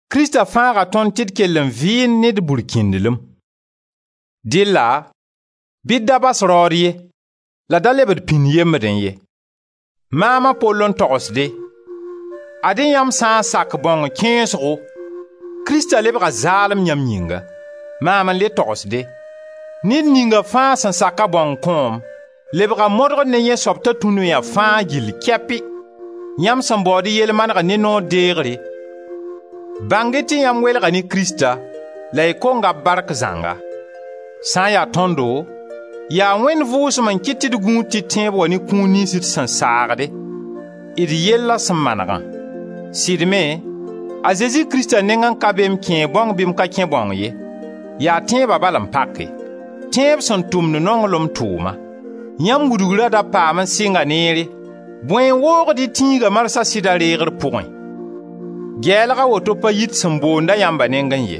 Krista fãaga tõnd tɩ d kell n vɩɩnd ne d burkĩndlem; dɩlla bɩ d da bas raood ye la d da leb d pĩnd yemdẽ ye. Maam a Pol n togsede: ad-y yãmb sã n sak bãong kẽesgo, Krista lebga zaalem yãmb yĩnga. Maam n le togsde: ned ninga fãa sẽn sak-a bãong kõom, lebga modgr ne yẽ soab ta tũ noya fãa gill kɛpi! Yãmb sẽn baood y yell manegr ne noor deegre, bãng-y tɩ yãmb welga ne Krista, la y konga b bark zãnga. Sã n ya tõndo, yaa Wẽnd Vʋʋsem n kɩt tɩ d gũud tɩ tẽeb wa ne kũun niyns d sẽn saagde, d yella sẽn manegã. Sɩd me, a Zezi Krista nengẽ ka be m kẽe bãong bɩ m ka kẽ bãong ye, yaa tẽeba bal n pake: tẽeb sẽn tʋmd nonglem tʋʋma. Yãmb wudgra da paam n sɩnga neere, bõe n woogd y tĩiga marsã sɩda reegre pʋgẽ? Gɛɛlg a woto pa yit sẽn boond-a yãmba nengẽ ye.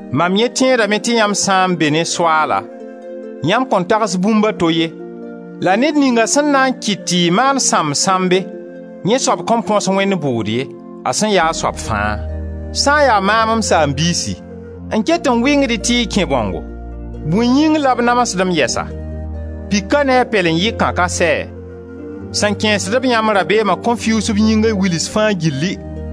Mam yẽ tẽedame tɩ yãmb sã n be ne Soaala, yãmb kõn tags bũmb a to ye, la ned ninga sẽn na n kɩt tɩ y maan sãmb-sãmbe, yẽ soab kõn põs Wẽnd bʋʋd ye, a sẽn ya a soab fãa. Sã n ya maam, m saam-biisi, n ket n wɩngd-y tɩ y kẽ bãongo, bõe yĩng la b namsd-m yɛsa? Pika ne a pɛlen-yɩkã ka sɛ? Sẽn kẽesd-b yãmb rabeema kõn fiuus b yĩnga wils fãa gilli!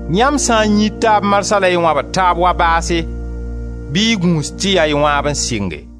Yãmb sã n yĩid taab marsã la y wãbd taab wa baase, bɩ y gũus tɩ yaa y wãab n sɩnge.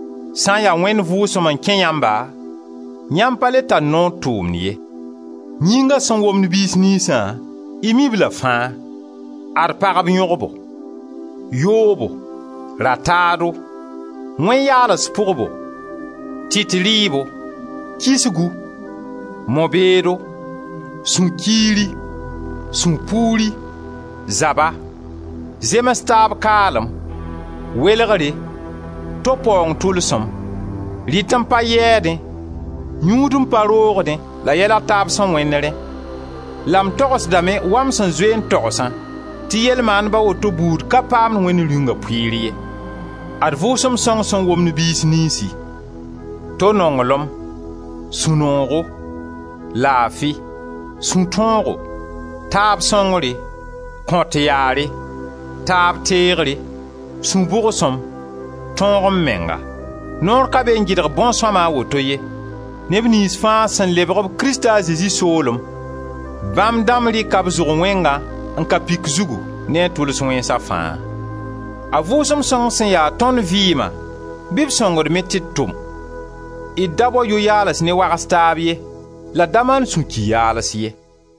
Sã n ya Wẽnd Vʋʋsem n kẽ yãmba, yãmb pa le tar noor tʋʋmd ye. Yĩnga sẽn womd biis niynsã, y mi-b-la fãa: ad pagb yõgbo, yoobo, rataado, wẽn-yaals pʋgbo, tɩt rɩɩbo, kisgu, mo-beedo, sũ-kiiri, sũ-puuri, zaba, zems-taab-kaalem, welegre, to paoong tʋlsem, rɩt-n-pa yɛɛdẽ, yũud-n-pa-roogdẽ la yɛl a taab sẽn wẽnd rẽ — la m togsdame wa m sẽn zoe n togsã tɩ yel-maandb a woto buud ka paamd Wẽnd Rĩunga pʋɩɩr ye. Ad Vʋʋsem sõng sẽn womd biis niynsi: to nonglem, sũ-noogo, laafi, sũ-tõogo, taab sõngre, kõt yaare, taab teegre, sũ-bʋgsem, tõog-m-menga. Noor ka be n gɩdg bõn-sõma a woto ye. Neb niyns fãa sẽn lebg-b Krista a Zezi soolem, bãmb dãmb rɩka b zʋg wẽngã n ka pik zugu ne a tʋls wẽnsa fãa. A Vʋʋsem Sõng sẽn ya tõnd vɩɩma, bɩ b sõng d me tɩ d tʋm. D da bao yʋ-yaals ne wags taab ye, la d da maan sũ-ki-yaals ye.